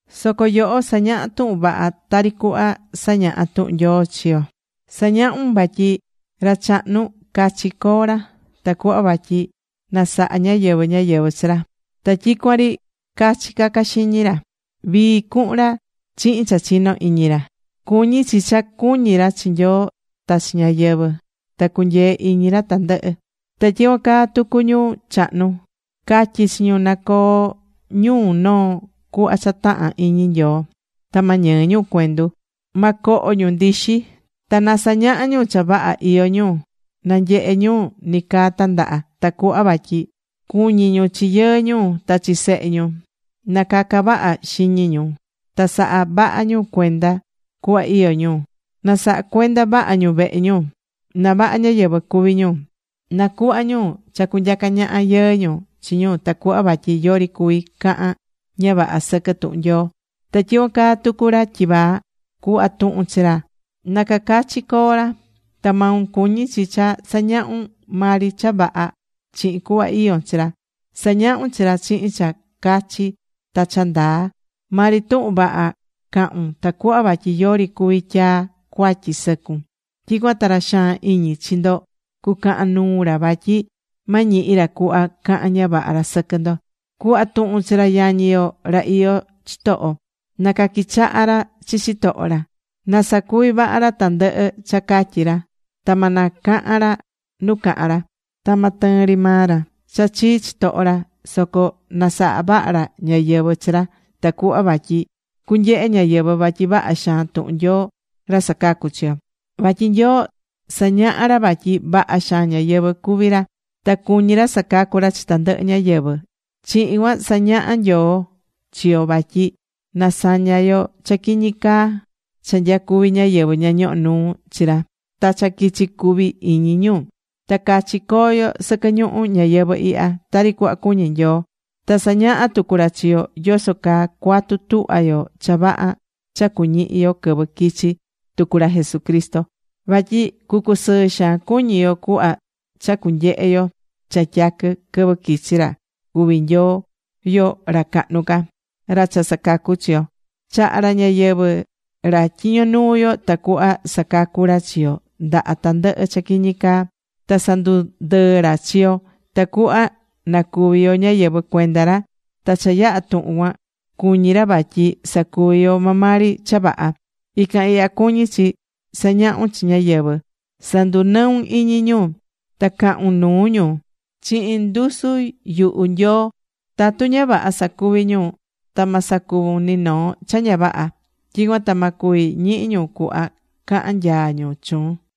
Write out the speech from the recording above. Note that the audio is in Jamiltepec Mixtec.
Soco yoho, sa̱ñaha tuhun vaha tari cuhva sañahá tuhun Nyoo chi yo. Sa̱ñahun vatyi ra chahnu, cachi co̱o ra, tacuhva vatyi na saha ñáyɨvɨ ñáyɨvɨ chi ra. Ta tyicuan ri cachi caca xiñi ra. Vii cu̱hun ra chihin cha chino iñi ra. Cuñí chi cha cuñí ra chi Nyoo ta chi ñáyɨvɨ. Ta cunyee iñi ra tandɨhɨ. Ta tyicuan caa tucu ñu chahnu. Ca̱tyi chi ñu na coo ñu noo cuhva cha tahán iñi Nyoo. Ta ma ñɨɨ ñu cuendu. Ma coho ñu ndixi. Ta na sañaha ñu cha vaha iyó ñu, na nyehe ñu nicaa tandaha. Tacuhva vatyi cuñi ñu chi yɨɨ ñu ta chi sehe ñu. Na caca vaha xiñi ñu. Ta sa̱ha vaha ñu cuenda cuhva iyó ñu. Na saha cuenda vaha ñu vehe ñu. Ta vaha ñáyɨvɨ cuvi ñu. Na cuhva ñu cha cunyaca ñaha yɨɨ ñu chi ñu tacuhva vatyi yori cuvi cahan ña vaha sɨquɨ tuhun Nyoo. Ta tyicuan caa tucu ra tyivaa. Cu̱hva tuhun chi ra na cacachi coo ra. Ta maun cuñí chi cha sa̱ñahun maa ri cha vaha chihin cuhva iyón chi ra. Sa̱ñahun chi ra chihin cha cachi ta cha ndaa. Maa ri tuhun vaha ca̱hun tacuhva vatyi yori cuvi tyaa cuatyi sɨcun. Tyicuan ta ra xaan iñi chi ndo cucahan nuu ra vatyi ma ñihi ra cuhva cahan ña vaha ra sɨquɨ ndo. Cu̱hva tuhun chi ra yañi yo ra iyó chitoho, na caquichaha ra chi chitoho ra. Na sacuvi vaha ra tandɨhɨ cha catyí ra. Ta ma na cahan ra nu cahan ra. Ta ma tɨɨn ri maa ra cha chii chitoho ra. Soco na saha vaha ra ñáyɨvɨ chi ra, tacuhva vatyi cunyehe ñáyɨvɨ vatyi vaha xaan tuhun Nyoo ra sacacú chi yo. Vatyi Nyoo sañahá ra vatyi vaha xaan ñáyɨvɨ cuví ra. Ta cuñí ra sacacu ra chi tandɨhɨ ñáyɨvɨ. Chihin cuan sañahá Nyoo chi yo vatyi na saña yo cha quiñi caa cha nyacuví ñáyɨvɨ ña ñohó nuu chi ra ta cha quichi cuvi iñi ñu. Ta cachi co̱o yo sɨquɨ ñuhu ñayɨvɨ̱ ihya, tari cuhva cuñí Nyoo. Ta sañahá tucu ra chi yo yoso caa cuatu tuhva yo cha vaha cha cuñihi yo quɨvɨ quichi tucu ra Jesucristo. Vatyi cucusɨɨ xaan cuñi yo cuhva cha cunyehe yo cha tyaquɨ quɨvɨ quichi ra cuví Nyoo yo ra cahnu ca, ra cha sacacú chi yo. Chaha̱ ra ñayɨvɨ̱ ra tyiño nuu yo tacuhva sacacu ra chi yo ndaha tandɨhɨ cha quiñi caa. Ta sandundɨɨ̱ ra chi yo tacuhva na cuvi yo ñáyɨvɨ cuenda ra, ta cha yaha tuhun cuan cuñí ra vatyi sacuvi yo maa maa ri cha vaha. Ican ihya cuñí chi sa̱ñahun chi ñáyɨvɨ. Sa̱ndunɨun iñi ñu. Ta ca̱hun nuu ñu chihin ndusu yuhu Nyoo tatu ña vaha sacuvi ñu. Ta ma sacuvun ni noo cha ña vaha. Tyicuan ta ma cuvi ñihi ñu cuhva cahan nyaa ñu chuun.